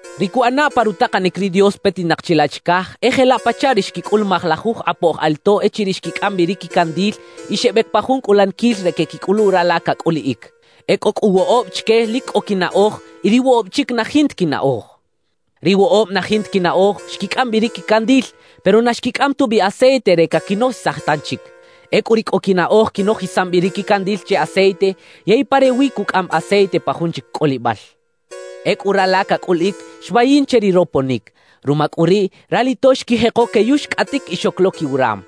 »Ri cuꞌana pa rutakanic ri Dios petinak chilaꞌ chicaj, e jelaꞌ pachaꞌ ri xquicꞌulumaj lajuj kꞌapoj alito echiriꞌ xquicꞌam bi ri quicandil y xebec pa jun cꞌulaniquil re queꞌquicꞌulu rala cacꞌuliꞌic. E cꞌo cꞌu woꞌob chique lic cꞌo quinaꞌoj y ri woꞌob chic na jinta quinaꞌoj. »Ri woꞌob na jinta quinaꞌoj xquicꞌam bi ri quicandil, pero na xquicꞌam tubi aceite re caquinojisaj tanchic. Ecꞌu ri cꞌo quinaꞌoj quinojisam bi ri quicandil che aceite, yey pa rewi cucꞌaꞌam aceite pa jun chic cꞌolibal. Ecꞌu rala cacꞌuliꞌic xmayin che ri roponic. Ruma cꞌu riꞌ, ralito xquijeko queyuxcꞌaꞌtic y xoc lo quiwaram.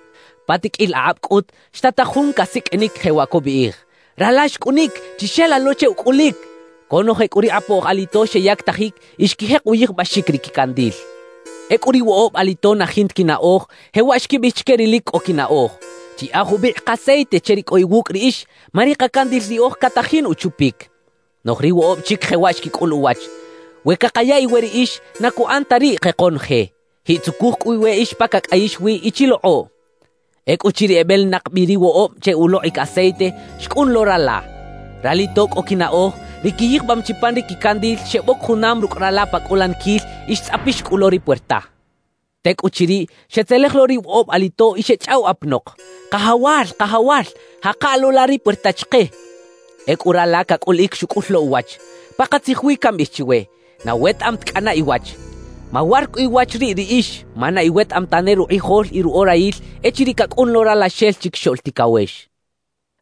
»Pa tiqꞌuil akꞌab cꞌut, xtataj jun casiqꞌuinic, jewaꞌ cubiꞌij: “¡Rala xcꞌunic! ¡Chixela lo che ucꞌulic!” Conoje cꞌu ri kꞌapoj alito xeyactajic y xquijek uyijbaxic ri quicandil. »Ecꞌu ri woꞌob alito na jinta quinaꞌoj jewaꞌ xquibiꞌij chique ri lic cꞌo quinaꞌoj: “Chiyaꞌa jubikꞌ kaceite che ri cꞌo iwucꞌ riꞌix, ma ri kacandil riꞌoj catajin uchupic.” »Noꞌj ri woꞌob chic jewaꞌ xquicꞌul uwach: “We cakaya iwe riꞌix, na cuꞌan ta riꞌ ke konoje. Jiꞌtzucuj cꞌu iweꞌix pa cacꞌayix wi y chilokꞌoꞌ.” »Ecꞌuchiriꞌ ebelinak bi ri woꞌob che ulokꞌic aceite, xcꞌun lo rala. Ralito cꞌo quinaꞌoj, ri quiyijbam chi pan ri quicandil, xeboc junam rucꞌ rala pa cꞌulaniquil y xtzꞌapix cꞌu lo ri puerta. »Tecꞌuchiriꞌ, xetzelej lo ri woꞌob alito y xechꞌaw apanok: “Kajawal, kajawal, jaka lo la ri puerta chike.” »Ecꞌu rala cacꞌuliꞌic xucꞌul lo uwach: “Pakatzij wi cambiꞌij chiwe: Na wetaꞌam ta cꞌana iwach.” »Mawar cꞌu iwach riꞌ riꞌix, ma na iwetaꞌam tane rukꞌijol y ruꞌorayil echiriꞌ cacꞌun lo Ralaxel Chiquixoꞌl Ticawex.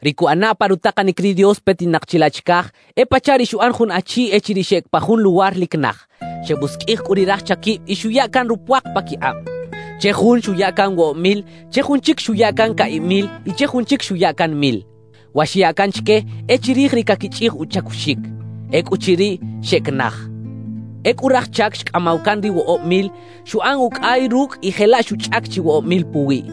»Ri cuꞌana pa rutakanic ri Dios petinak chilaꞌ chicaj, e pachaꞌ ri xuꞌan jun achi echiriꞌ xeꞌec pa jun luwar lic naj; xebusiqꞌuij cꞌu ri raj chaquib y xuya can rupuak paquikꞌab. Che jun xuya can woꞌob mil, che jun chic xuya can caꞌib mil y che jun chic xuya can mil. Wa xyaꞌ can chique e chirij ri caquichꞌij uchacuxic. Ecꞌuchiriꞌ, xeꞌec naj. »Ecꞌu raj chac xcꞌamaw can ri woꞌob mil, xuꞌan ucꞌay rucꞌ y jelaꞌ xuchꞌac chi woꞌob mil puwiꞌ.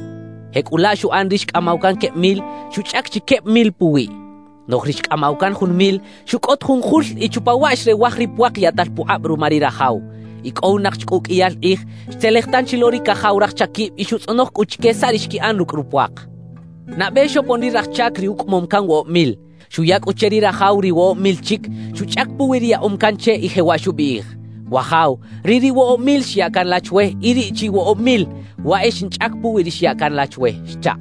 Jecꞌulaꞌ xuꞌan ri xcꞌamaw can queb mil, xuchꞌac chi queb mil puwiꞌ. Noꞌj ri xcꞌamaw can jun mil, xucꞌot jun jul y chupa waꞌ xrewaj ri puak yaꞌtal pukꞌab ruma ri rajaw. »Icꞌowinak chi cꞌu uqꞌuiyal kꞌij, xtzelej tanchi lo ri cajaw raj chaquib y xutzꞌonoj cꞌu chique saꞌ ri xquiꞌan rucꞌ rupuak. Nabe xopon ri raj chac ri ucꞌamom can woꞌob mil. Xuya cꞌu che ri rajaw ri woꞌob mil chic xuchꞌac puwi ri yaꞌom can che y jewaꞌ xubiꞌij: “Wajaw, riꞌ ri woꞌob mil xya can la chwe y riꞌ chi woꞌob mil, waꞌ e xinchꞌac puwi ri xya can la chwe” xchaꞌ.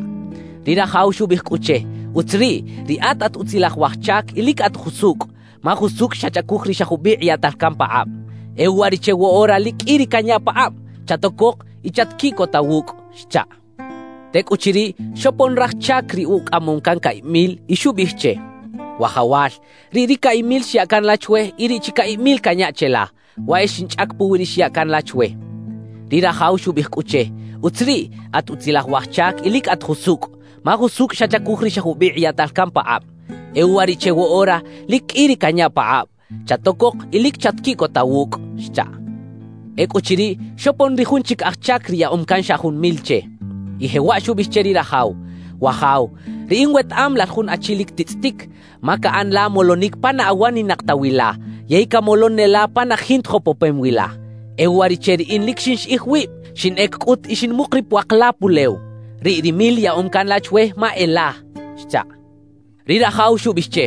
»Ri rajaw xubiꞌij cꞌu che: “Utz riꞌ, riꞌat at utzilaj waj chac y lic at jusucꞌ; ma jusucꞌ xachacuj ri xa jubikꞌ yaꞌtal can pakꞌab. E uwariꞌche woꞌora lic qꞌui ri canya pakꞌab. Chatocok y chatquiꞌcota wucꞌ” xchaꞌ. »Tecꞌuchiriꞌ, xopon raj chac ri ucꞌamom can caꞌib mil y xubiꞌij che: “Wajawal, riꞌ ri caꞌib mil xya can la chwe y riꞌ chi caꞌib mil canya cheꞌla, waꞌ e xinchꞌac puwi ri xya can la chwe” xchaꞌ. »Ri rajaw xubiꞌij cꞌu che: “Utz riꞌ, at utzilaj waj chac y lic at jusucꞌ; ma jusucꞌ xachacuj ri xa jubikꞌ yaꞌtal can pakꞌab. E uwariꞌche woꞌora lic qꞌui ri canya pakꞌab. Chatocok y lic chatquiꞌcota wucꞌ” xchaꞌ. »Ecꞌuchiriꞌ, xopon ri jun chic aj chac ri yaꞌom can xa jun mil che, y jewaꞌ xubiꞌij che ri rajaw: “Wajaw, riꞌin wetaꞌam lal jun achi lic titzꞌitic, ma caꞌan la molonic pa na awaninak ta wi la yey camolon ne la pa na jinta jopopem wi la. E uwariꞌche riꞌin lic xinxiꞌij wib. Xinꞌec cꞌut y xinmuk ri puak la pulew. Riꞌ ri mil yaꞌom can la chwe, ma e la” xchaꞌ. »Ri rajaw xubiꞌij che: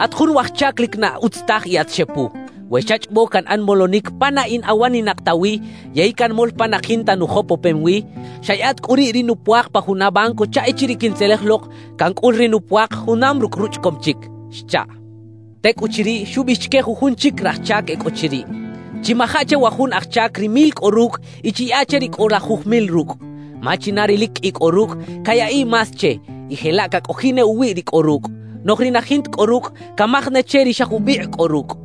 “At jun waj chac lic na utz taj y at xepu. We xachꞌobo canꞌan molonic pa na in awaninak ta wi yey canmol pa na jinta nujopopem wi, xaꞌyaꞌa ta cꞌu riꞌ ri nupuak pa juna banco chaꞌ echiriꞌ quintzelej lok, cancꞌul ri nupuak junam rucꞌ ruchꞌacom chic” xchaꞌ. »Tecꞌuchiriꞌ, xubiꞌij chique jujun chic raj chac e cꞌo chiriꞌ: “Chimaja che wa jun aj chac ri mil cꞌo rucꞌ y chiyaꞌa che ri cꞌo lajuj mil rucꞌ. Ma china ri lic qꞌui cꞌo rucꞌ, cayaꞌiꞌ más che y jelaꞌ cacꞌojiꞌ ne uwiꞌ ri cꞌo rucꞌ. Noꞌj ri na jinta cꞌo rucꞌ, camaj ne che ri xa jubikꞌ cꞌo rucꞌ.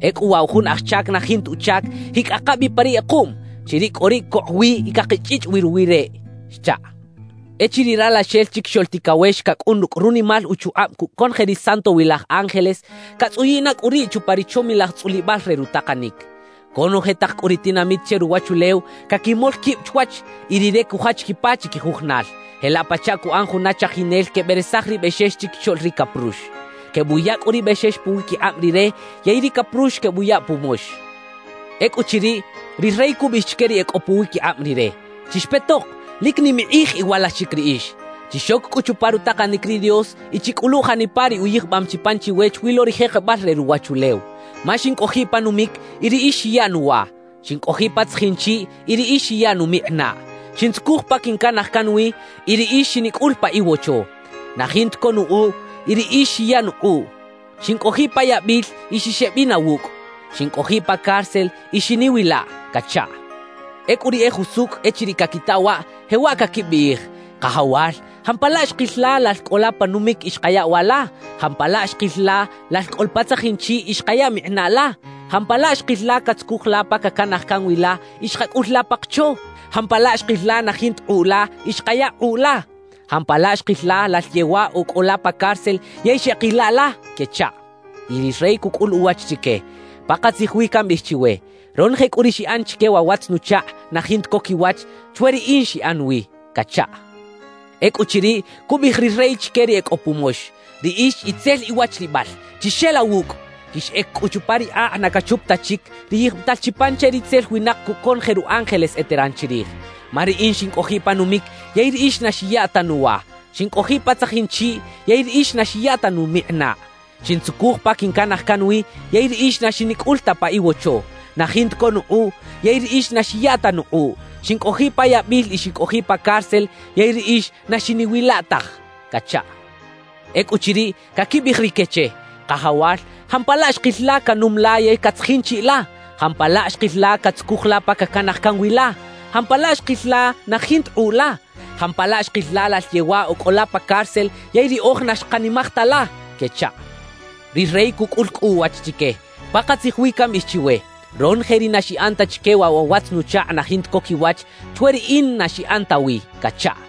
Ecꞌu waꞌ wa jun aj chac na jinta uchac, jiꞌcꞌaka bi pa ri kꞌekuꞌm; chiriꞌ cꞌu riꞌ cokꞌ wi y cakichꞌichꞌ wi ruwiꞌ reꞌ” xchaꞌ. »Echiriꞌ Ralaxel Chiquixoꞌl Ticawex cacꞌun rucꞌ runimal uchukꞌab cucꞌ conoje ri santowilaj ángeles, catzꞌuyiꞌ na cꞌu riꞌ chupa ri chomilaj tzꞌulibal re rutakanic. Conoje tak cꞌu ri tinamit che ruwachulew caquimol quib chwach y Rire cujach quipa chiquijujunal, jelaꞌ pachaꞌ cuꞌan juna chajinel queberesaj ri bexex chiquixoꞌl ri caprux. Quebuya cꞌu ri bexex puwiquikꞌab Rire yey ri caprux quebuya pumox. »Ecꞌuchiriꞌ, ri rey cubiꞌij chique ri e cꞌo puwiquikꞌab Rire: “¡Chixpetok! ¡Lic nim ikꞌij iwalaxic riꞌix! Chixoc cꞌu chupa rutakanic ri Dios y chicꞌulu janipa ri uyijbam chi pan chiwe chwi lo ri jekebal re ruwachulew. Ma xincꞌojiꞌ pa numic y riꞌix xiya nuwa; xincꞌojiꞌ pa tzajin chiꞌ y riꞌix xiya numikꞌinaꞌ; xintzucuj pa quincanaj can wi y riꞌix xinicꞌul pa iwocho. Na jinta co nukꞌuꞌ y riꞌix xiya nukꞌuꞌ; xincꞌojiꞌ pa yabil y xixeꞌbina wucꞌ; xincꞌojiꞌ pa cárcel y xiniꞌwilaꞌ” cachaꞌ. »Ecꞌu ri e jusucꞌ echiriꞌ caquita waꞌ, jewaꞌ caquibiꞌij: “Kajawal, ¿jampalaꞌ xkil la lal cꞌo la pa numic y xkaya wa la? ¿Jampalaꞌ xkil la lal cꞌo la pa tzajin chiꞌ y xkaya mikꞌinaꞌ la? ¿Jampalaꞌ xkil la catzucuj la pa cacanaj can wi la y xkacꞌul la pa kocho? ¿Jampalaꞌ xkil la na jinta kꞌuꞌ la y xkaya kꞌuꞌ la? ¿Jampalaꞌ xkil la lal yewaꞌ o cꞌo la pa cárcel yey xeꞌkila la?” quechaꞌ. »Y ri rey cucꞌul uwach chique: “Pakatzij wi cambiꞌij chiwe: Ronoje cꞌu ri xiꞌan chique wa watz-nuchakꞌ na jinta co quiwach, chwe riꞌin xiꞌan wi” cachaꞌ. »Ecꞌuchiriꞌ, cubiꞌij ri rey chique ri e cꞌo pumox: “Riꞌix itzel iwachlibal, chixela wucꞌ; quixꞌec cꞌu chupa ri akꞌ na cachup ta chic, ri yijbital chi pan che ritzel winak cucꞌ conoje ru ángeles eteran chirij. Ma riꞌin xincꞌojiꞌ pa numic yey riꞌix na xiya ta nuwa; xincꞌojiꞌ pa tzajin chiꞌ, yey riꞌix na xiya ta numikꞌinaꞌ. Xintzucuj pa quincanaj can wi, yey riꞌix na xinicꞌul ta pa iwocho. Na jinta co nukꞌuꞌ, yey riꞌix na xiya ta nukꞌuꞌ. Xincꞌojiꞌ pa yabil y xincꞌojiꞌ pa cárcel, yey riꞌix na xiniꞌwila taj” cachaꞌ. »Ecꞌuchiriꞌ, caquibiꞌij rique che: “Kajawal, ¿jampalaꞌ xkil la canum la yey catzajin chiꞌ la? ¿Jampalaꞌ xkil la catzucuj la pa cacanaj can wi la? ¿Jampalaꞌ xkil la na jinta kꞌuꞌ la? ¿Jampalaꞌ xkil la lal yewaꞌ o cꞌo la pa cárcel, yey riꞌoj na xkanimaj ta la?” quechaꞌ. »Ri rey cucꞌul cꞌu uwach chique: “Pakatzij wi cambiꞌij chiwe: Ronoje ri na xiꞌan ta chique wa watz-nuchakꞌ na jinta co quiwach, chwe riꞌin na xiꞌan ta wi” cachaꞌ.